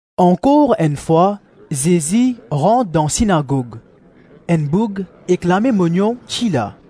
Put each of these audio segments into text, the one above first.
Ankor enn fwa, Zezi rant dan sinagog; enn boug ek lame mognon ti la.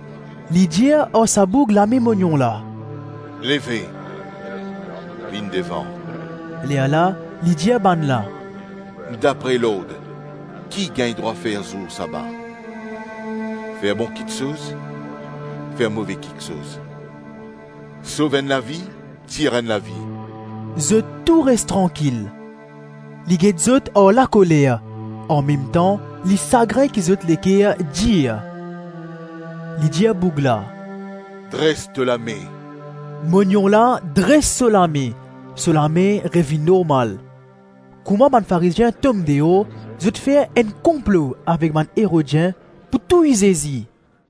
Li dir ar sa boug lame mognon la, “Leve, vinn devan.” Lerla li dir bannla, “Dapre lord, ki gagn drwa fer zour saba? Fer bon kiksoz, fer move kiksoz? Sov enn lavi, tir enn lavi?” Zot tou res trankil. Li get zot ar lakoler, anmemtan, li sagrin ki zot leker dir. Li dir boug la, “Dres to lame.” Mognon la dres so lame; so lame revinn normal. Kouma bann Farizien tom deor, zot fer enn konplo avek bann Erodien pou touy Zezi.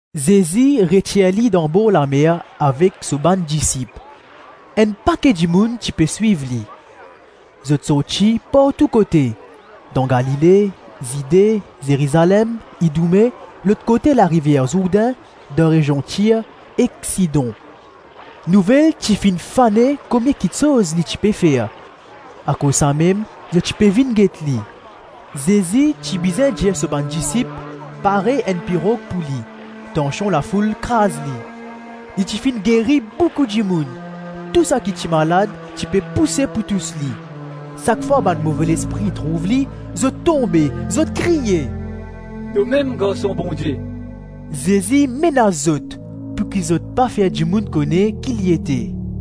Zezi retir li dan borlamer avek so bann disip. Enn pake dimoun ti pe swiv li. Zot sorti partou kote dan Galile, Zide, Zerizalem, Idoume, lot kote larivier Zourdin, dan rezion Tir ek Sidon. Nouvel ti finn fane komie kiksoz li ti pe fer; akoz samem zot ti pe vinn get li. Zezi ti bizin dir so bann disip pare enn pirog pou li, tansion lafoul kraz li. Li ti finn geri boukou dimoun; tou saki ti malad, ti pe pouse pou tous li. Sak fwa bann move lespri trouv li, zot tonbe, zot kriye, “Tomem Garson Bondie.” Zezi menas zot pouki zot pa fer dimoun kone ki li ete.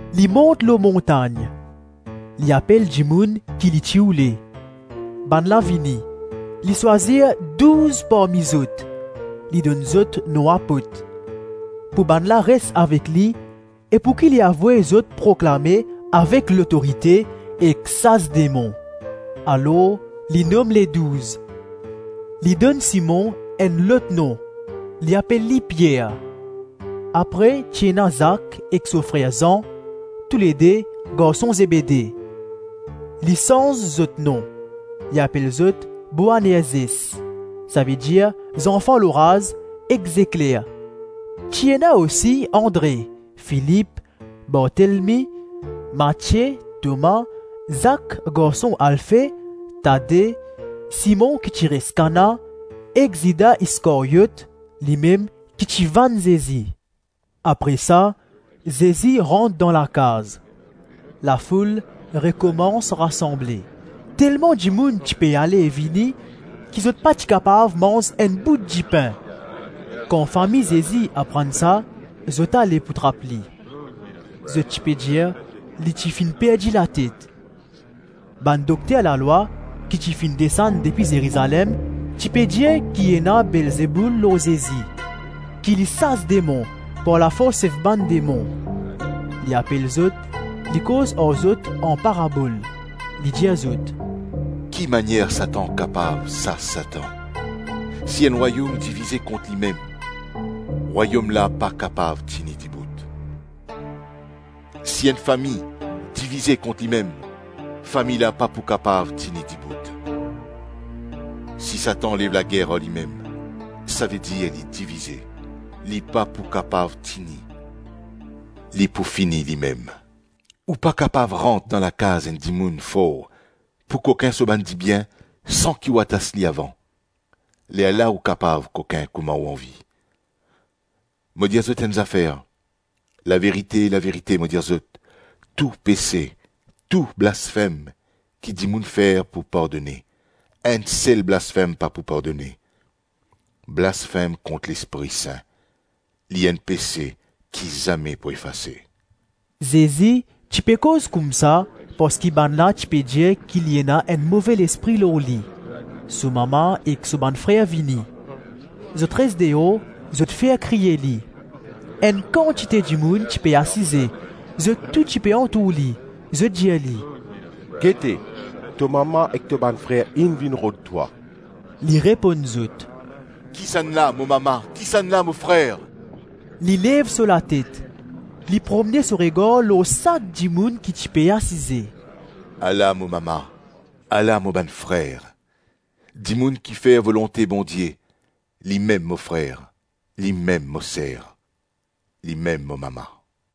Li mont lor montagn. Li apel dimoun ki li ti oule. Bannla vini. Li swazir douz parmi zot, (li donn zot nom apot), pou bannla res avek li e pouki li avoy zot proklame avek lotorite sas demon. Alors li nom Ledouz. Li donn Simon enn lot nom, li apel li Pier; apre ti ena Zak ek so frer Zan, toulede garson Zebede. Li sanz zot nom, li apel zot Boanerzes, savedir zanfan loraz ek zekler; ti ena osi Andre, Filip, Bartelmi, Matie, Toma, Zak garson Alfe, Tade, Simon ki ti res Kana ek Zida Iskaryot, limem ki ti vann Zezi. Apre sa Zezi rant dan lakaz. Lafoul rekomans rasanble; telman dimoun ti pe ale-vini, ki zot pa ti kapav manz enn bout dipin. Kan fami Zezi aprann sa, zot ale pou trap li. Zot ti pe dir li ti finn perdi latet. Bann dokter lalwa ki ti finn desann depi Zerizalem ti pe dir ki ena Belzeboul lor Zezi, ki li sas demon par lafors sef bann demon. Li apel zot, li koz ar zot an parabol. Li dir zot, “Ki manier Satan kapav sas Satan? Si enn Rwayom divize kont limem, Rwayom la pa kapav tini dibout. Si enn fami divize kont limem, fami la pa pou kapav tini dibout. Si Satan lev lager ar limem, savedir li divize, li pa pou kapav tini, li pou fini limem. Ou pa kapav rant dan lakaz enn dimoun for pou kokin so bann dibien san ki ou atas li avan; lerla ou pou kapav kokin kouma ou anvi. Mo dir zot enn zafer: laverite, laverite mo dir zot, tou pese, tou blasfem, ki dimoun fer pou pardone; enn sel blasfem pa pou pardone, blasfem kont Lespri Sin. Li enn pese ki zame pou efase.” Zezi ti pe koz koumsa parski bannla ti pe dir ki li ena enn move lespri lor li. So mama ek so bann frer vini. Zot res deor zot fer kriye li. Enn kantite dimoun ti pe asize; zot tou ti pe antour li; zot dir li, “Gete, to mama ek to bann frer inn vinn rod twa.” Li reponn zot, “Kisannla mo mama, kisannla mo frer?” Li lev so latet, li promne so regar lor sak dimoun ki ti pe asize. “Ala mo mama, ala mo bann frer. Dimoun ki fer volonte Bondie, limem mo frer, limem mo ser, limem mo mama.”